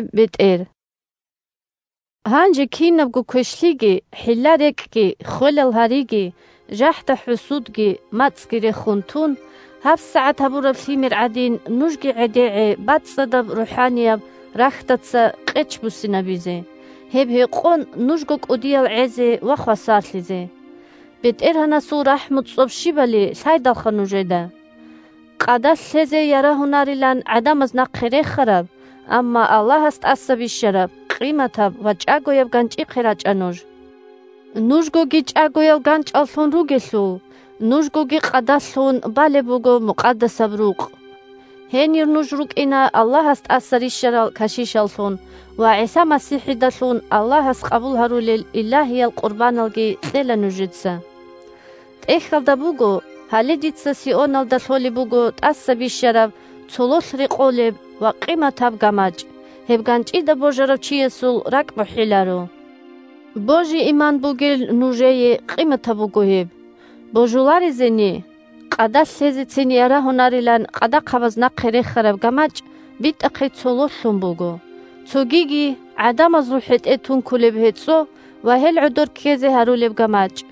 бетӀер 1Гьанже кинабго квешлъиги, хӀилла-рекӀкӀги, ххвелал гьариги, жахӀда-хӀусудги, мацӀги рехун тун, 2гьабсагӀат гьабураб лъимер гӀадин, нужги гӀедегӀе бацӀцӀадаб рухӀанияб рахьдаца къеч буссинабизе, гьеб гьекъон нужго кӀудиял гӀезе ва хвасарлъизе. БетӀергьанасул рахӀму-цӀоб щибали лъайдалха нужеда! Къадалъ лъезе ярагьунарилан гӀадамаз нахъе рехараб, амма Аллагьас тӀаса бищараб, къиматаб ва чӀагояб ГанчӀихъе рачӀа нуж. Нужгоги чӀагоял ганчӀаллъун ругелъул, нужгоги къадалъ лъун балеб буго мукъадасаб рукъ. Гьенир нуж рукӀина Аллагьас тӀаса рищарал кашишаллъун, ва ГӀиса МасихӀидалъун Аллагьас къабул гьарулел илагьиял къурбаналги кьела нужеца. ТӀехьалда буго: «Гьале дица Сионалда лъолеб буго тӀаса бищараб, цололъ рекъолеб ва къиматаб гамачӀ. Гьеб ганчӀида божарав чиясул ракӀбухӀиларо». Божи-иман бугел нужее къиматаб буго гьеб. Божуларезени – «Къадалъ лъезецин ярагьунарилан къадахъабаз нахъе рехараб гамачӀ битӀахъе цололъ лъун буго». Цогиги: «ГӀадамазул хӀетӀе тункулеб гьецӀо ва гьел гӀодор ккезе гьарулеб гамачӀ».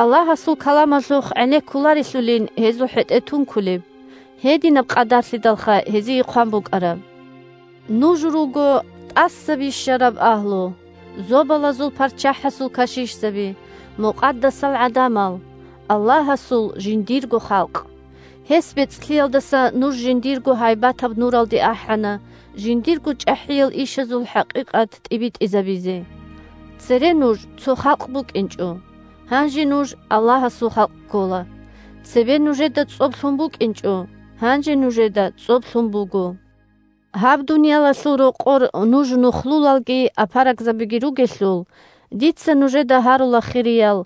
Аллагьасул каламалъухъ гӀенеккуларелъулин гьезул хӀетӀе тункулеб, – гьединаб къадарлъидалха гьезие хъван букӀараб. Нуж руго тӀаса бищараб агьлу – Зобалазул ПарччахӀасул кашишзаби, мукъадасал гӀадамал, Аллагьасул жиндирго халкъ. Гьес бецӀлъиялдаса нуж жиндирго гьайбатаб нуралде ахӀана жиндирго чӀахӀиял ишазул хӀакъикъат тӀибитӀизабизе. Цере нуж цо халкъ букӀинчӀо, гьанже нуж Аллагьасул халкъ ккола. Цебе нужеда цӀоб лъун букӀинчӀо, гьанже нужеда цӀоб лъун буго. Гьаб дуниялалъул рокъор нуж нухлулалги апарагзабиги ругелъул, дица нужеда гьарула, хириял,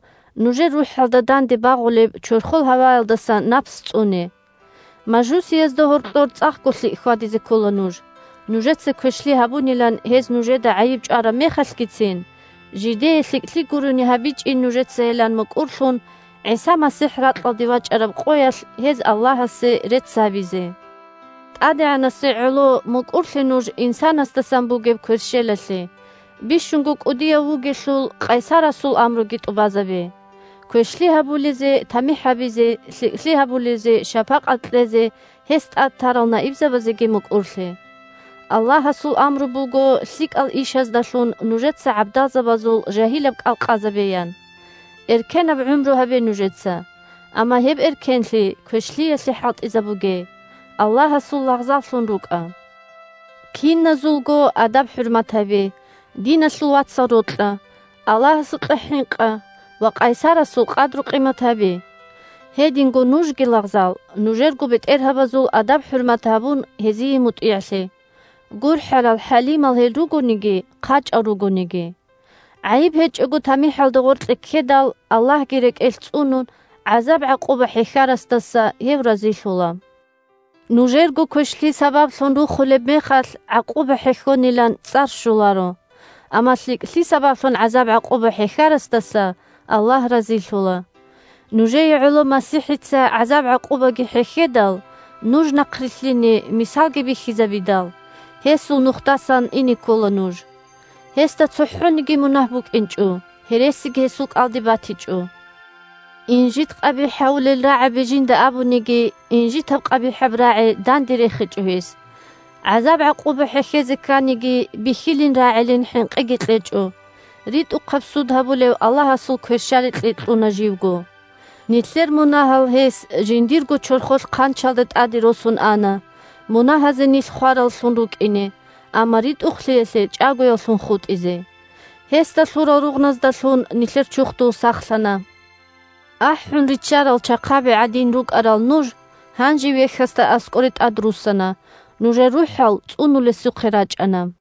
нужер рухӀалда данде багъулеб чорхол гьаваялдаса напс цӀуне. Мажусиязда гьоркьор цӀакъго лъикӀ хьвадизе ккола нуж, нужеца квешлъи гьабунилан гьез нужеда гӀайиб чӀвараб мехалъгицин, жидее лъикӀлъи гурони гьабичӀин нужецайилан мукӀурлъун, ГӀиса МасихӀ ракьалде вачӀараб къоялъ гьез Аллагьасе рецц гьабизе. ТӀадегӀанасе гӀоло мукӀурлъе нуж инсанасдасан бугеб кверщелалъе – бищунго кӀудияв вугелъул, къайсарасул амруги тӀубазабе. Квешлъи гьабулезе тамихӀ гьабизе, лъикӀлъи гьабулезе шапакъат кьезе гьес тӀад тарал наибзабазеги мукӀурлъе. Аллагьасул амру буго лъикӀал ишаздалъун нужеца гӀабдалзабазул жагьилаб кӀал къазабеян. Эркенаб гӀумру гьабе нужеца, амма гьеб эркенлъи квешлъиялъе хӀалтӀизабуге, – Аллагьасул лагъзаллъун рукӀа. Киназулго адаб-хӀурмат гьабе, диналъул вацал рокьа, Аллагьасукьа хӀинкъа ва къайсарасул къадру-къимат гьабе. Гьединго нужги, лагъзал, нужерго бетӀергьабазул адаб-хӀурмат гьабун, гьезие мутӀигӀлъе, – гурхӀарал-хӀалимал гьел ругониги, хъачӀал ругониги. ГӀайиб гьечӀого тамихӀалда гъоркье ккедал Аллагьги рекӀелъ цӀунун гӀазаб-гӀакъуба хӀехьарасдаса Гьев разилъула. Нужерго квешлъи сабаблъун рухулеб мехалъ гӀакъуба хӀехьонилан цӀар щоларо. Амма лъикӀлъи сабаблъун гӀазаб-гӀакъуба хӀехьарасдаса Аллагь разилъула. Нужее гӀоло МасихӀица гӀазаб-гӀакъубаги хӀехьедал, нуж нахърилълъине мисалги бихьизабидал, гьесул нухдасан ине ккола нуж. Гьесда цохӀониги мунагь букӀинчӀо, гьересиги гьесул кӀалдиб батичӀо. Инжит-къабихӀ гьавулел рагӀаби жинда абуниги, инжитаб-къабихӀаб рагӀи данде рехичӀо гьес. ГӀазаб-гӀакъуба хӀехьезе кканиги, бихьилин-рагӀилин хӀинкъиги кьечӀо, ритӀухъаб суд гьабулев Аллагьасул кверщаликье кьуна живго. Нилъер мунагьал гьес жиндирго чорхолъ хъанчалда тӀаде росун ана, мунагьазе нилъ хвараллъун рукӀине, амма ритӀухълъиялъе – чӀагояллъун хутӀизе. Гьесда лъурал ругъназдалъун нилъер чурхдул сахлъана. АхӀун риччарал чахъаби гӀадин рукӀарал нуж гьанже Вехьасда аскӀоре тӀадруссана, нужер рухӀал цӀунулесухъе рачӀана.